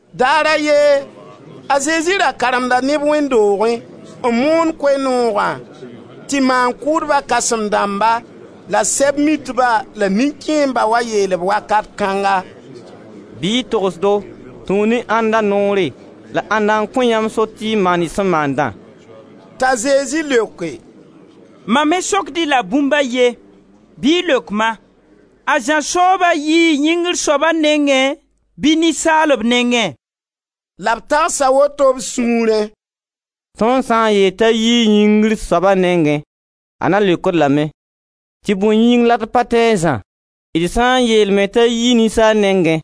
Daar a ye, a Zezi ra karemda neb wẽnd doogẽ n moond Koe-noogã tɩ maan-kʋʋdba kãsem dãmba la Sɛb-mitba la nin-kẽembã wa yeel-b wakat kãnga: «Bɩ y togs-do, tũu ne ãnda noore, la ãnda n kõ yãmb sor tɩ y maan y sẽn maandã?» T'a Zezi leoke: «Mam me sokd-y la bũmb a ye, bɩ y leok ma: A Zã sooba yii Yĩngr Soaba nengẽ bɩ ninsaalb nengẽ?» La b tagsa woto b sũurẽ: «Tõnd sã n yeel t'a yii Yĩngri Soaba nengẽ, a na n leokd-d lame tɩ bõe yĩng la d pa tẽ a Zã. D sã n yeel me t'a yii ninsaalb nengẽ,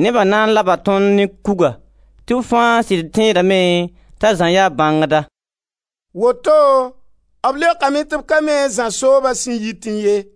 neba na n laba tõnd ne kuga tɩ b fãa sɩd da tẽedame t'a Zã yaa bãngda.» Woto b leokame tɩ b ka mi a Zã sooba sẽn yitẽ ye.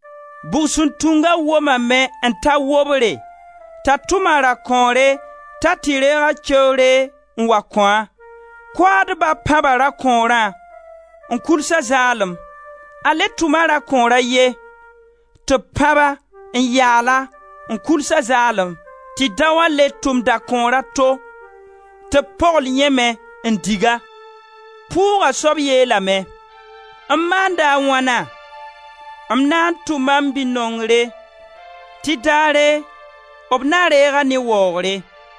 Bugsuntunga womame n ta wobre, t'a tʋm a rakõore t'a tɩ reeg a keoore n wa kõ-a. Koaadba pãba rakõorã, n kuls-a zaalem. A le tʋma rakõor a ye, tɩ b pãb-a, n yaal-a, n kuls-a zaalem. Tɩ daoã le tʋm dakõor a to, tɩ b pogl yẽ me, n dig-a. Pʋʋga soab yeelame: ‹M maanda a wãna? M na n tʋma m bi-nongre tɩ daare b na reeg-a ne waoogre.›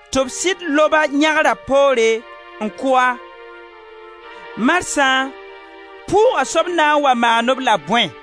Tɩ b sɩd lob-a yãgra poore n kʋ-a. Marsã pʋʋga soab na n wa maan-b la bõe?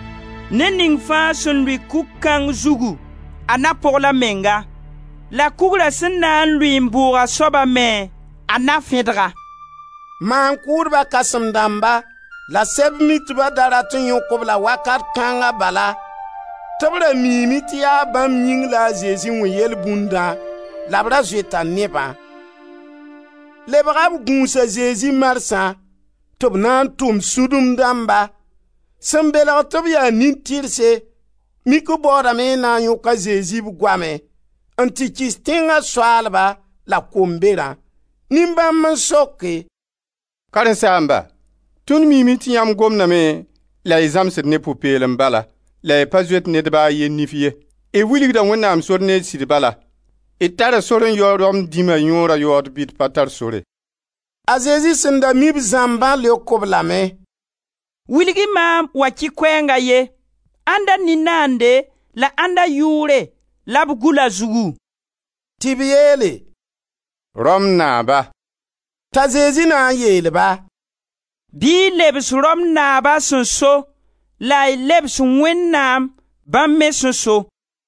Ned ning fãa sẽn lʋɩ kug kãng zugu a na pogl a menga, la kugra sẽn na n lʋɩ n bʋʋg a soaba me, a na fẽdg-a.» Maan-kʋʋdba kãsem-dãmba la Sɛb-mitba da rat n yõk-b la wakat kãnga bala tɩ b ra miime tɩ yaa bãmb yĩng la a Zezi wẽ yelbũndã la b ra zoeta nebã. Lebga b gũus a Zezi marsã; tɩ b na n tʋm sũdum dãmba, sẽn belg tɩ b yaa nin-tɩrse, mik b baoodame n na n yõk a Zezi b goamẽ, n tɩ kɩs tẽnga soaalba la Komberã. Nin-bãmb n soke: «Karen-saamba, tõnd miime tɩ yãmb gomdame la y zãmsd ne pʋ-peelem bala, la y pa zoet ned ba a ye nif ye, y wilgda Wẽnnaam sor ne sɩd bala. D tara sor n yao Rom dĩma yõora yaood bɩ d pa tar sore?» A Zezi sẽn da mi b zãmbã leok-b lame: «Wilg-y maam wakɩ-koɛɛng a ye: ãnda nin-naande la ãnda yʋʋre la b gʋl a zugu?» Tɩ b yeele: «Rom naaba.» T'a Zezi na n yeel-ba: «Bɩ y lebs Rom naab a sẽn so, la y lebs Wẽnnaam, bãmb me sẽn so.»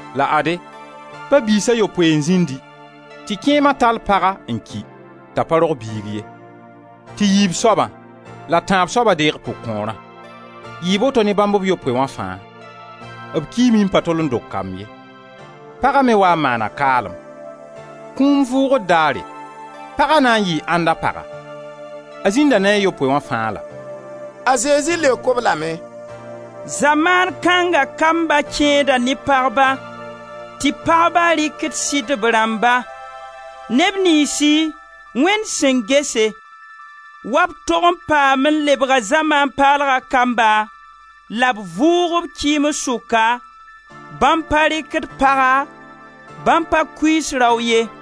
La ade, ba-biis a yopoe n zĩndi, tɩ kẽema tall paga n ki, t'a pa rog biig ye. Tɩ yiib soaba, la tãab soaba deeg pʋg-kõorã. Yɩɩ boto ne bãmb b yopoe wã fãa: b kiime n pa tol n dog kamb ye. Paga me waa n maana kaalem. Kũum vʋʋgr daare, paga na n yɩɩ ãnda paga: a zĩnda ne a yopoe wã fãa la?» A Zezi leok-b lame: «Zamaan kãnga kamba kẽeda ne pagba tɩ pagba rɩkd sɩdb rãmba. Neb niynsi Wẽnd sẽn gese wa b tog n paam n lebga zamaan paalga kamba la b vʋʋg-b kɩɩms sʋka, bãmb pa rɩkd paga, bãmb pa kuiis rao ye.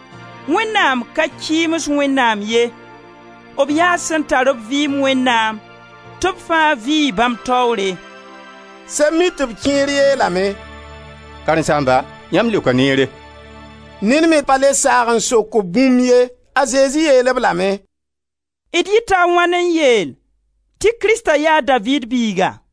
Wẽnnaam ka kɩɩms Wẽnnaam ye, b yaa sẽn tar-b vɩɩm Wẽnnaam, tɩ b fãa vɩ bãmb taoore.» Sɛb-mitb kẽer yeelame: «Karen-saamba, yãmb leoka neere!» Ned me da pa le saag n sok-b bũmb ye. A Zezi yeel-b lame: «D yɩta a wãn n yeel tɩ Krista yaa a Daviid biiga?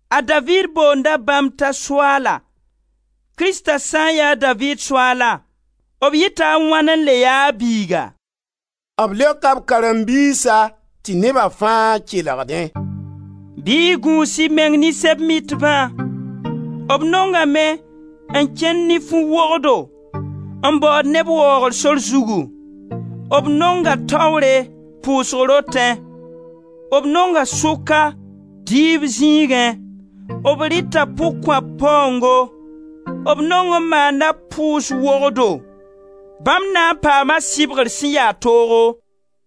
A Daviid boonda bãmb t'a Soaala, Krista sã n ya a Daviid Soaala, b yɩta a wãn n le ya a biiga?» B leoka b karen-biisa tɩ neba fãa kelgdẽ: «Bɩ y gũus y meng ne Sɛb-mitbã; b nongame n kẽnd ne fu-wogdo n baood neb waoogr sor zugu; b nonga taoore, pʋʋsg rotẽ; b nonga sʋka dɩɩb zĩigẽ. B rɩta pʋg-kõap paoongo, b nong n maana pʋʋs-wogdo: bãmb na n paama sɩbgr sẽn ya toogo.»